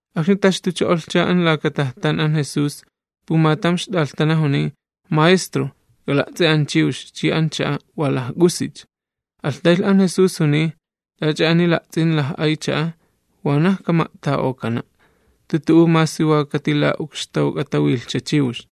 Akxni taxtucho'olhcha an laka tajtan an Jesús, pumatam ixt'alhtana juniy: ―¡Maestro, k'ala'ts'i an chiwx chi an cha'a wa lajk'usicha! Alhtaylh an Jesús juniy: ―T'ach'a ani la'ts'in laj'ay cha'a, wanaj kama'ta'okana', jantu tu'u masi wa katila'ukxtawk'atawilhcha chiwx.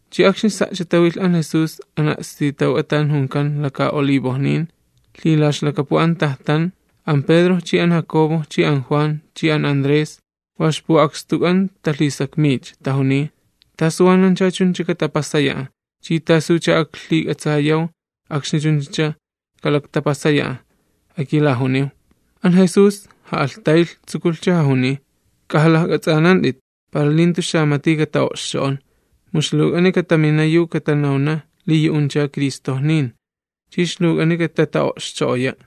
Chi akxni sa'cha tawilh an Jesús an a'stitawk'a tan junkan Laka'Olivojnin, lhilaxlakapu an tajtan, an Pedro chi an Jacobo chi an Juan chi an Andrés wa ixpu'akstuk'an talhisakmiycha, tajuniy: ―¿Tasu wanancha chuncha katapasaya'a? ¿Chi tasucha aklhik'atsayaw akxni chunchacha kalaktapasaya'a? Akilajuniw. An Jesús ja'alhtaylh tsukulhcha jajuniy: ―K'ajalajk'ats'anant'it, para li jantu xamati kata'o'xcho'on. Mu ixluwk'ani katamina yu katanawna: Kit'ini ijCristo, chi ixluwk'ani katata'o'xcho'oya'.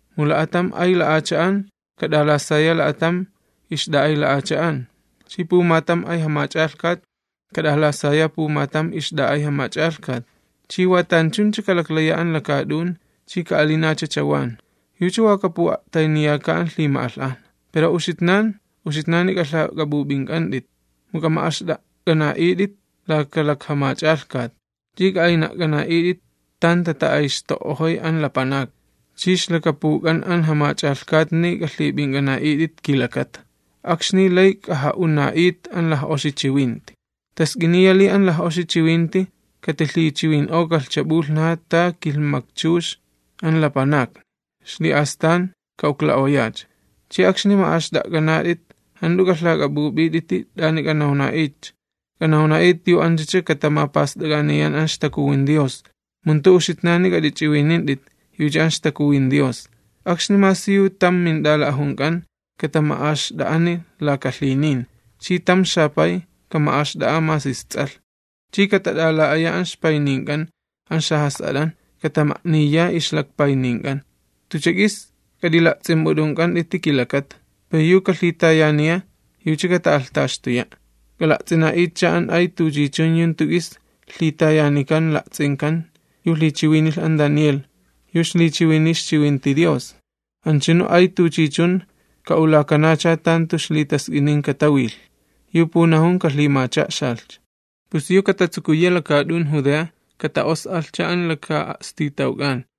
Mu kilhmaktam lapanak kat'alasaya akilhmaktam lapanak chi pumatam ay jamach'alhkat kat'alasaya apumatam ixt'a'ay jamach'alhkat. Chi wa tanchuncha kalaklaya an lakaat'un chi ka'alinacha chawan. Yucha wa kapu'a'tayniyaka an lhima'alh'ajna. ’Pero uxitnan, uxitnani k'alhak'ap'up'ink'ant'it, mu k'ama'axt'a'k'ana'it'it laka lakjamach'alhkat, chi k'a'ayna'k'ana'it'iti tan tata'ayxto'ojoy an lapanakni, chi ixlakapuk'an an jamach'alhkatni k'alhip'ink'ana'it'iti kilakata. Akxni lay k'aja'una'it an laj'oxi chiwinti. Task'iniya li an laj'oxi chiwinti katijamak'atsaani'okalhcha p'ulhnaja ta kilhmakchux an lapanakni ta'alin, xli'astan ka'ukla'oyacha. Chi akxni ma'axt'a'k'anat'it, jant'u k'alhak'ap'up'it'iti t'ani k'anawna'itcha, k'anawna'it yu anchacha katamapast'ak'aniyan an ixTakuwin Dios, mu jantu uxitnani k'at'ichiwinint'it yucha an ixTakuwin Dios. Akxni masi yu tam mint'ala'ajunk'an katama'axt'a'ani laka lhinin, chi tam xapay kama'axt'a'a masi ists'alh, chi katat'ala'ayacha an ixpaynink'an an xajas'at'an, katama'niya ixlakpaynink'an. Tucha k'is k'at'ila'ts'imp'ut'unk'ant'iti kilakata, pero yu kalhitayaniya, yucha kata'alhtaxtuya'. ’K'ala'ts'ina'itcha an ay tuchichun yu jantu k'is lhitayanikan la'ts'inkan yu lhichiwinilh an Daniel, yu ixlichiwiniy ixchiwinti Dios. Anchunu ay tuchichun ka'ulakanacha tan jantu ixlitask'inin katawilh, (yu punajun kalhimacha'xalhcha), pus yu katatsukuya lakaat'un Judea, kata'os'alhcha an laka'a'stitawk'an.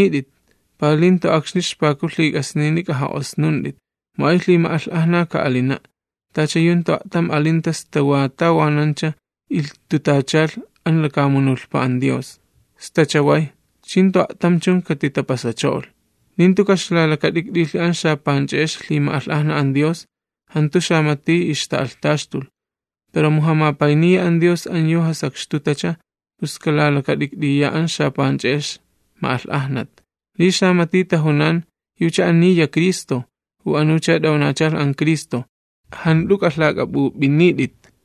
K'at'ap'aynit'it, para li jantu akxni ixpaku lhik'asnini k'aja'osnunt'it. Mu ay lhima'alh'ajna ka'alina', tacha yu jantu a'tam alinta sta wa tawanancha ilhtutachalh an lakamunulhpa an Dios, sta chaway, chi jantu a'tam chun katitapasacho'olh. Li jantu kaxlalakat'ikt'ilhi an xapanch'e'ex lhima'alh'ajna an Dios, jantu xamati ixta'alhtaxtulh, pero mu jamapayniya an Dios an yu jasakxtutacha, pus kalalakat'ikt'iya an xapanch'e'ex ma'alh'ajnat. ’Li xamati tajunan: “Anicha t'ajun Cristo, u anucha t'awnachalh Cristo”, jant'u k'ak'iklak'a'it.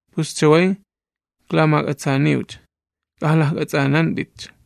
Pus chaway iklamak'atsaaniwcha, ¡k'ajalajk'ats'anant'itcha!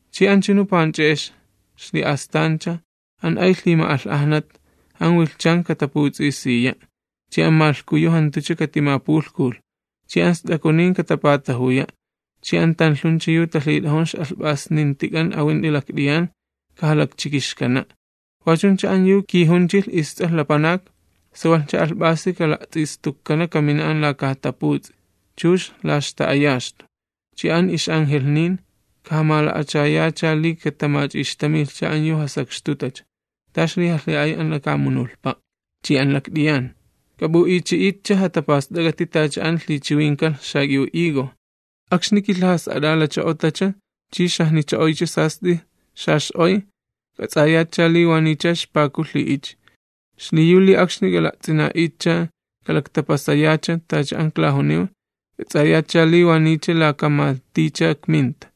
’Chi anchunu panch'e'ex, xli'astancha an ay lhima'alh'ajna, an wilhchan kataputs'isiya', chi an malhkuyu jantucha katimapulhkulh. Chi an st'akunin katapatajuya', chi an yu talhit'ajun ix'alhp'asnintik'an awint'i lakt'iyan kajalakchikixkana'. Wachuncha an yu kijunchilh isTs'alh Lapanak, sawalhcha alhp'asi kala'ts'istukkana kamina an laka jataputs'i, chux la ixta'ayaxtu. Chi an ix'angelhnin, kajamala'achayacha li katamach'ixtamilhcha an yu jasakxtutacha, ta ixlijalhi'ay an lakamunulhpa chi an lakt'iyan. ’K'ap'ulhimach'a'xatcha t'ach'a an lhixa'alak'ant'it xak'iw higo. Akxni lajkilhawilhcho'olhcha, chi xajnicho'oyachilhcha sast'i xax'oy, k'ats'ayatcha li wa niycha ixpaku lhi'ichi. Xliyu li akxni k'ala'ts'ina'itcha kalaktapasaya tacha an iklajuniw, k'ats'ayatcha li wa niycha laka maticha ikminta.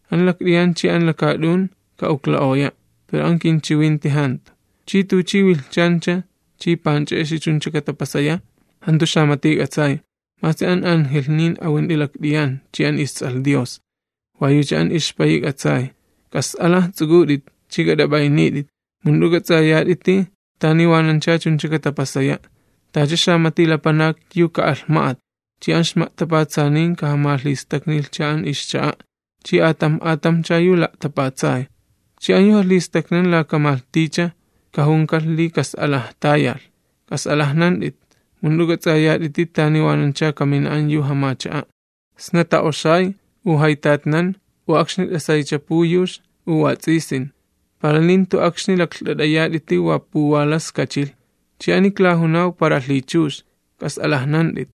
An lakt'iyan chi an lakaat'un ka'ukla'oya', pero an kinchiwinti jantu. ’Chi tuchi wilhchancha chi tuchi panch'e'excha chuncha katapasaya, jantu xamati k'atsay, masi an angelhnin awint'i lakt'iyan chi an masi an isTsálh Dios, wa yucha an ixPayi k'atsay. ’K'as'alaj ts'uk'ut'it ch'i k'at'ap'aynit'it, mu jant'u k'ats'ayat'iti tani wanancha chuncha katapasaya'. Tacha xamati lapanak yu ka'alh ma'at, chi an ixma'tapatsanin kajamalhistaknilhcha an ixcha'a chi atamj atamjcha yu la'tapatsay. Chi an yu jalhistaknan laka malhticha, kajunikalh li kas'alaj tayalh. K'as'alajnant'it, mu jant'u k'ats'ayat'iti tani wanancha kamina an yu jamacha'a', sna ta'oxay, u jaytatnan, u akxni t'asaycha puyux, u wats'isin. Para li jantu akxni laklht'at'ayat'iti wa puwalas kachilh. Chi ani klajunaw para lhichux, k'as'alajnant'it.